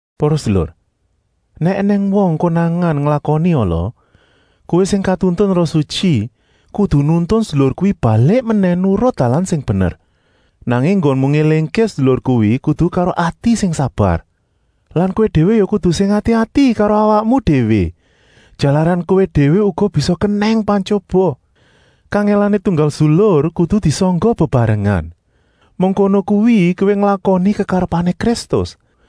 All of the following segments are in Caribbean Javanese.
Para sedulur, nèk ènèng wong konangan nglakoni ala, kowé sing katuntun Roh Sutyi kudu nuntun sedulur kuwi balik menèh nurut dalan sing bener. Nanging enggonmu ngélingké sedulur kuwi kudu karo ati sing sabar. Lan kowé déwé ya kudu sing ati-ati karo awakmu déwé, jalaran kowé déwé uga bisa kenèng pantyoba. Kangèlané tunggal sedulur kudu disangga bebarengan. Mengkono kuwi kowé nglakoni kekarepané Kristus.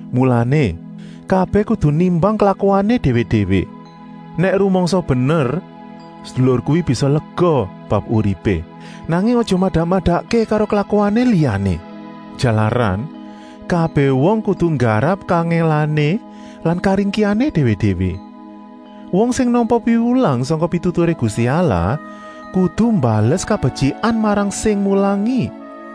Mulané, kabèh kudu nimbang klakuané déwé-déwé. Nèk rumangsa bener, sedulur kuwi bisa lega bab uripé, nanging aja madak-madakké karo klakuané liyané. Jalaran, kabèh wong kudu nggarap kangèlané lan karingkihané déwé-déwé. Wong sing nampa piwulang sangka pituturé Gusti Allah kudu mbales kabetyikan marang sing mulangi.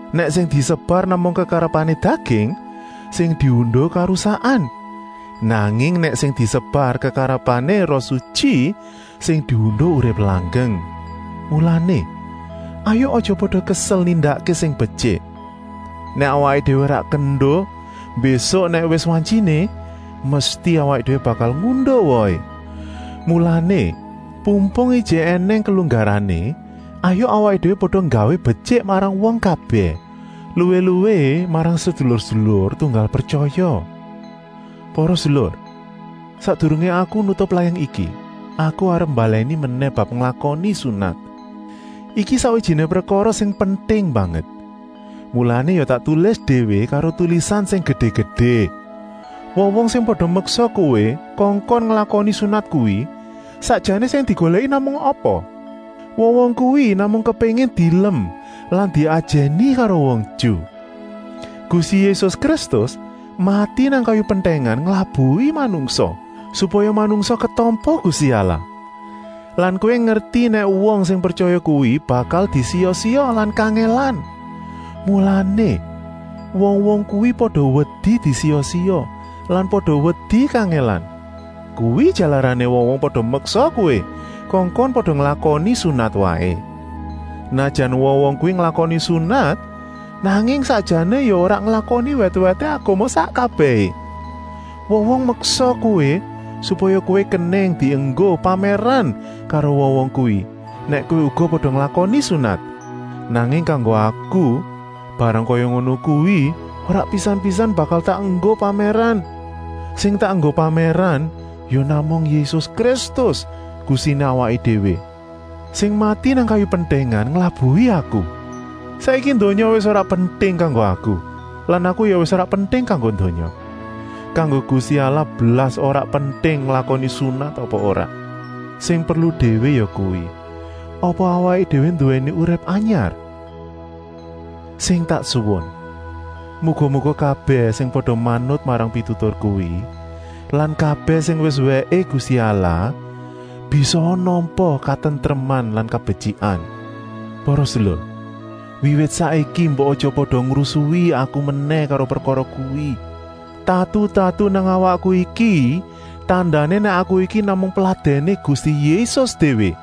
Nèk sing disebar namung kekarepané daging, sing diunduh karusakan. Nanging nèk sing disebar kekarepané Roh Sutyi, sing diunduh urip langgeng. Mulané, hayuk aja pada kesel nindakké sing betyik. Nèk awaké déwé ora kendo, mbésuk nèk wis wantyiné, mesti awaké déwé bakal ngunduh wohé. Mulané, pumpung ijik ènèng kelunggarané, hayuk awaké déwé pada nggawé betyik marang wong kabèh, luwih-luwih marang sedulur-sedulur tunggal pretyaya. Para sedulur, sakdurungé aku nutup layang iki aku arep mbalèni menèh bab nglakoni sunat. Iki sakwijiné prekara sing penting banget, mulané ya tak tulis déwé karo tulisan sing gedé-gedé. Wong-wong sing pada meksa kowé kongkon nglakoni sunat kuwi sakjané sing digolèki namung apa? Wong-wong kuwi namung kepéngin dielem lan diajèni karo wong Ju. Gusti Yésus Kristus mati nang kayu pentèngan nglabuhi manungsa, supaya manungsa ketampa Gusti Allah. Lan kowé ngerti nèk wong sing pretyaya kuwi bakal disiya-siya lan kangèlan. Mulané, wong-wong kuwi pada wedi disiya-siya lan pada wedi kangèlan. Kuwi jalarané wong-wong pada meksa kowé kongkon pada nglakoni sunat waé. Senajan wong-wong kuwi nglakoni sunat, nanging sakjané ya ora nglakoni wèt-wèté agama sak kabèhé. Wong-wong meksa kowé, supaya kowé kenèng dienggo pamèran karo wong-wong kuwi nèk kowé uga pada nglakoni sunat. Nanging kanggo aku barang kaya ngono kuwi ora pisan-pisan bakal tak enggo pamèran. Sing tak enggo pamèran ya namung Yésus Kristus, Gustiné awaké déwé, sing mati nang kayu pentèngan nglabuhi aku. Saiki donya wis ora penting kanggo aku lan aku ya wis ora penting kanggo donya. Kanggo Gusti Allah blas ora penting nglakoni sunat apa ora. Sing perlu déwé yakuwi: apa awaké déwé nduwèni urip anyar? Sing tak suwun, muga-muga kabèh sing pada manut marang pitutur kuwi lan kabèh sing wis wèké Gusti Allah bisaa nampa katentreman lan kabetyikan. Para sedulur, wiwit saiki mbok aja pada ngrusui aku menèh karo prekara kuwi. Tatu-tatu nang awakku iki tandané nèk aku iki namung peladèné Gusti Yésus déwé.